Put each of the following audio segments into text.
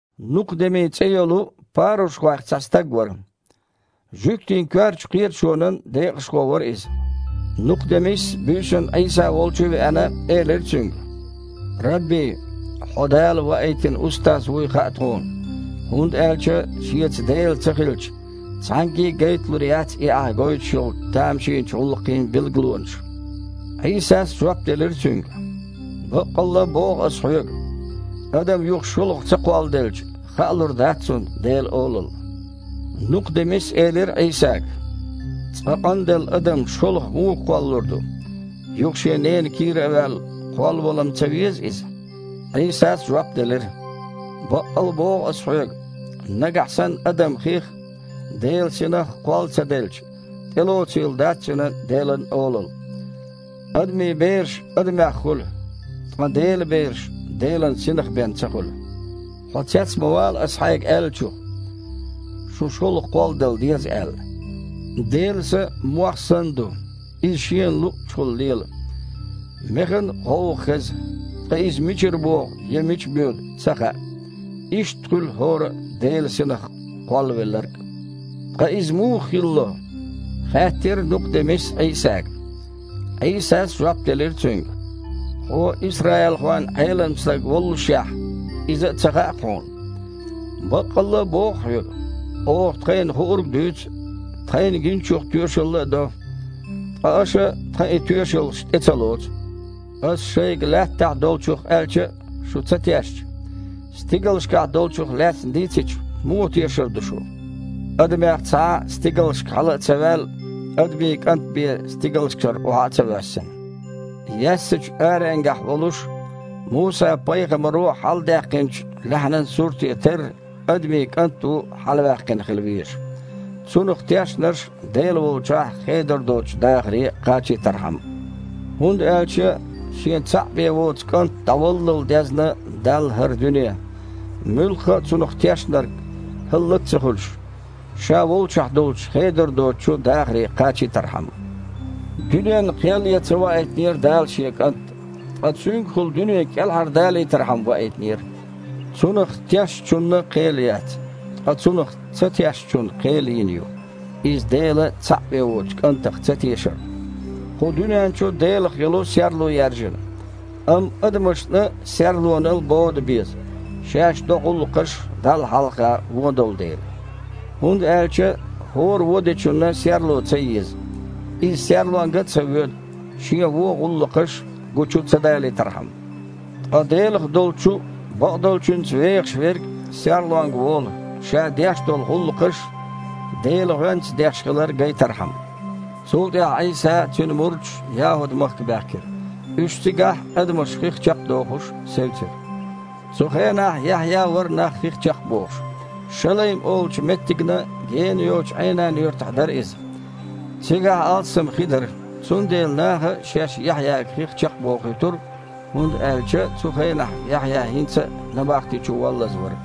Нукха-Деми цІе йолу парушхойх цхьа стаг вара. Жуьгтийн коьртачу кхеташонан декъашхо вара иза. Нукха-Демис, буьйсанна Іийса волчу а веана, элира Цуьнга: « Рабби! Хьо Дала ваийтина устаз вуй хаьа тхуна. ХІунда аьлча шеца Дела ца хилча, цхьаьнгге а гайталур яц и Ахь гойтуш йолу тамашийнчу гІуллакхийн билгалонаш». Іийсас жоп делира цуьнга: «Баккъалла а боху Ас хьоьга, адам юха шолгІа ца кхолладелча, хаалур дац цунна Делан Олалла». Нукха-Демис элира Іийсага: «Цкъа къанделла адам шолгІа муха кхоллалур ду? Юха шен ненан кийра а ваьлла, кхоллавала-м ца веза иза?» Іийсас жоп делира: «Баккъалла а боху Ас хьоьга, нагахь санна адам хих а, Делан Синах а кхолла ца делча, тІелоцийла дац цуьнан Делан Олалла. Адамийн бераш адамех хуьлу, ткъа Делан бераш Делан Синах бен ца хуьлу. Хьо цец ма вала Ас хьайга аьллачух: „Шун шолгІа кхолладала деза“, – аьлла. Делан Са мох санна ду. Иза шена луъучухула лела. Механ гІовгІа хеза, ткъа иза мичара богІу а, мича боьду а ца хаьа. Иштта хуьлу хІора а Делан Синах кхоллавелларг а». «Ткъа иза муха хилало?» – хаьттира Нукха-Демис Іийсага. Іийсас жоп делира цуьнга: «Хьуо исраилхойн Іелам стаг воллушехь, иза а ца хаьа-кх хьуна? Баккъалла а боху хьоьга, оха тхайна хуург а дуьйцу, тхайна гиначух тоьшалла а до, ткъа аша тхан и тоьшаллаш тІе ца лоцу. Ас шайга лаьттахь долчух аьлча а, шу ца тешча, стигалшкахь долчух лаьцна дийцича, муха тешар ду шу? Адамех цхьа а стигалшка хьала а ца ваьлла, Адамийн КІант бен стигалшкара охьа а ца воьссина. Яьссачу аренгахь волуш Муса-пайхамаро хьаладаьккхинчу лаьхьанан суьрте терра Адамийн КІант а ву хьалаваьккхина хила везаш, Цунах тешнарш Дела волчохь хедар доцучу дахаре кхачийтархьама». ХІунда аьлча Шен цхьаъ бен воцу КІант дІаваллал дезна Далла хІара дуьне, муьлхха а Цунах тешнарг, хІаллак а ца хуьлуш, Ша волчохь долчу хедар доцучу дахаре кхачийтархьама. Дуьненна кхел ян ца ваийтинера Дала Шен КІант, ткъа Цуьнгахула дуьне кІелхьардалийтархьама ваийтинера. Цунах тешначунна кхел яц. Ткъа Цунах ца тешначунна кхел йина ю, иза Делан цхьаъ бен воцучу КІантах цатешарна. Кху дуьнен чу Делах йолу серло яьржина, амма адамашна серлонал бода беза, шаьш до гІуллакхаш Далла хьалха вон долу дела. ХІунда аьлча хІора вон дечунна серло ца еза, иза серлонга а ца воьду, шен вон гІуллакхаш гучу ца далийтархьама. Ткъа Делах долчу бакъдолчуьнца вехаш верг серлонга волу, ша деш долу гІуллакхаш Делан гІоьнца деш хилар гайтархьама. Цул тІаьхьа Іийса а, Цуьнан мурдаш а ЯхІуд-махка баьхкира. Уьш цигахь, адамаш хих чекхдохуш, севцира. Цу хенахь Яхьъя а вара нах хих чекхбохуш. Шалейм олучу меттигна гена йоцучу Іейнан-юьртахь дара иза. Цигахь алссам хи дара, цундела наха шаьш Яхьъяга хих чекхбохуьйтура, хІунда аьлча цу хенахь Яхьъя хІинца а набахти чу воллаза вара.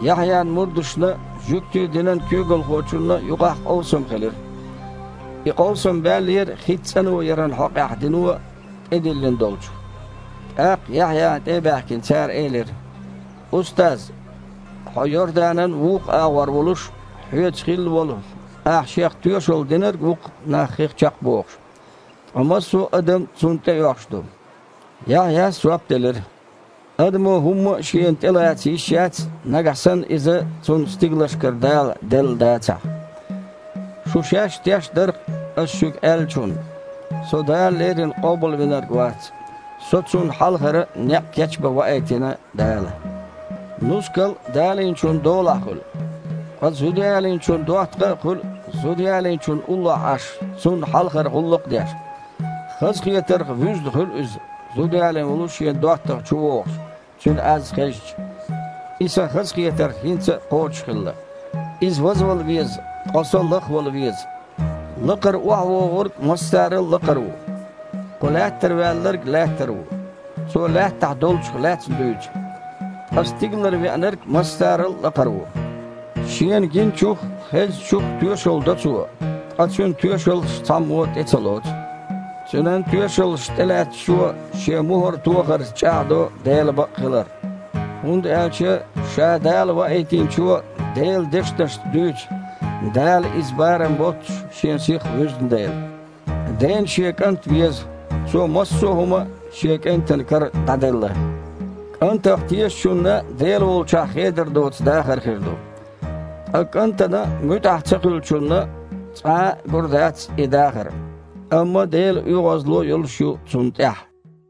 Яхьъян мурдашна а, жуьгтийн динан куьйгалхочунна а юкъахь къовсам хилира. И къовсам баьллера хица цІано яран хьокъехь дино тІедиллина долчух. ТІаккха, Яхьъяна тІе а баьхкина, цара элира: «Устаз, хьо Йорданан вукху агІор волуш, хьоьца хилла волу, ахь Шех тоьшалла динарг а ву-кх нах хих чекхбохуш. Ткъа массо адам Цунна тІеоьхуш ду». Яхьъяс жоп делира: «Адамо хІумма а шена тІелаца йиш яц, нагахь санна иза цунна стигалшкара Дала делла дацахь. Шу шаьш а теш дар-кх ас шуьга аьллачунна: „Со Дала леррина Къобалвинарг вац. Со Цунна хьалхара некъ кечбан ваийтина Дала“. Нускал а далийначун долахь хуьлу, ткъа зудаялийначун доттагІа а хуьлу зудаялийначунна уллохь Іаш, цунна хьалхара гІуллакх а деш. Хазахетарх вуьзна хуьлу иза, зуда ялийна волу шен доттагІа чувогІуш, цуьнан аз хезча. И сан хазахетар хІинца кхочушхилла. Иза вазвала веза, ткъа со лахвала веза». Лакхара ОхьавогІург массарал а лакхара ву. Кху Лаьттара ваьлларг Лаьттара ву, цо Лаьттахь долчух лаьцна дуьйцу. Ткъа стигалара Веанарг массарал а лакхара ву. Шена гиначух а, хезначух а тоьшалла до Цо, ткъа Цуьнан тоьшаллаш цхьаммо а тІе ца лоцу. Цуьнан тоьшаллаш тІелаьцначо шен мухІар тохарца чІагІдо Дела бакъхилар. ХІунда аьлча Ша Дала Ваийтинчо Делан дешнашца дуьйцу, Дала иза барам боццуш Шен Сих вуьзна дела. Дена Шен КІант веза. Цо массо а хІума Шен КІентан кара дІаделла. КІантах тешачунна Дела волчохь хедар доцу дахар хир ду. Ткъа КІантана муьтІахь ца хуьлучунна цкъа а гур дац и дахар, амма Делан оьгІазло а йолуш ю цунна тІехь.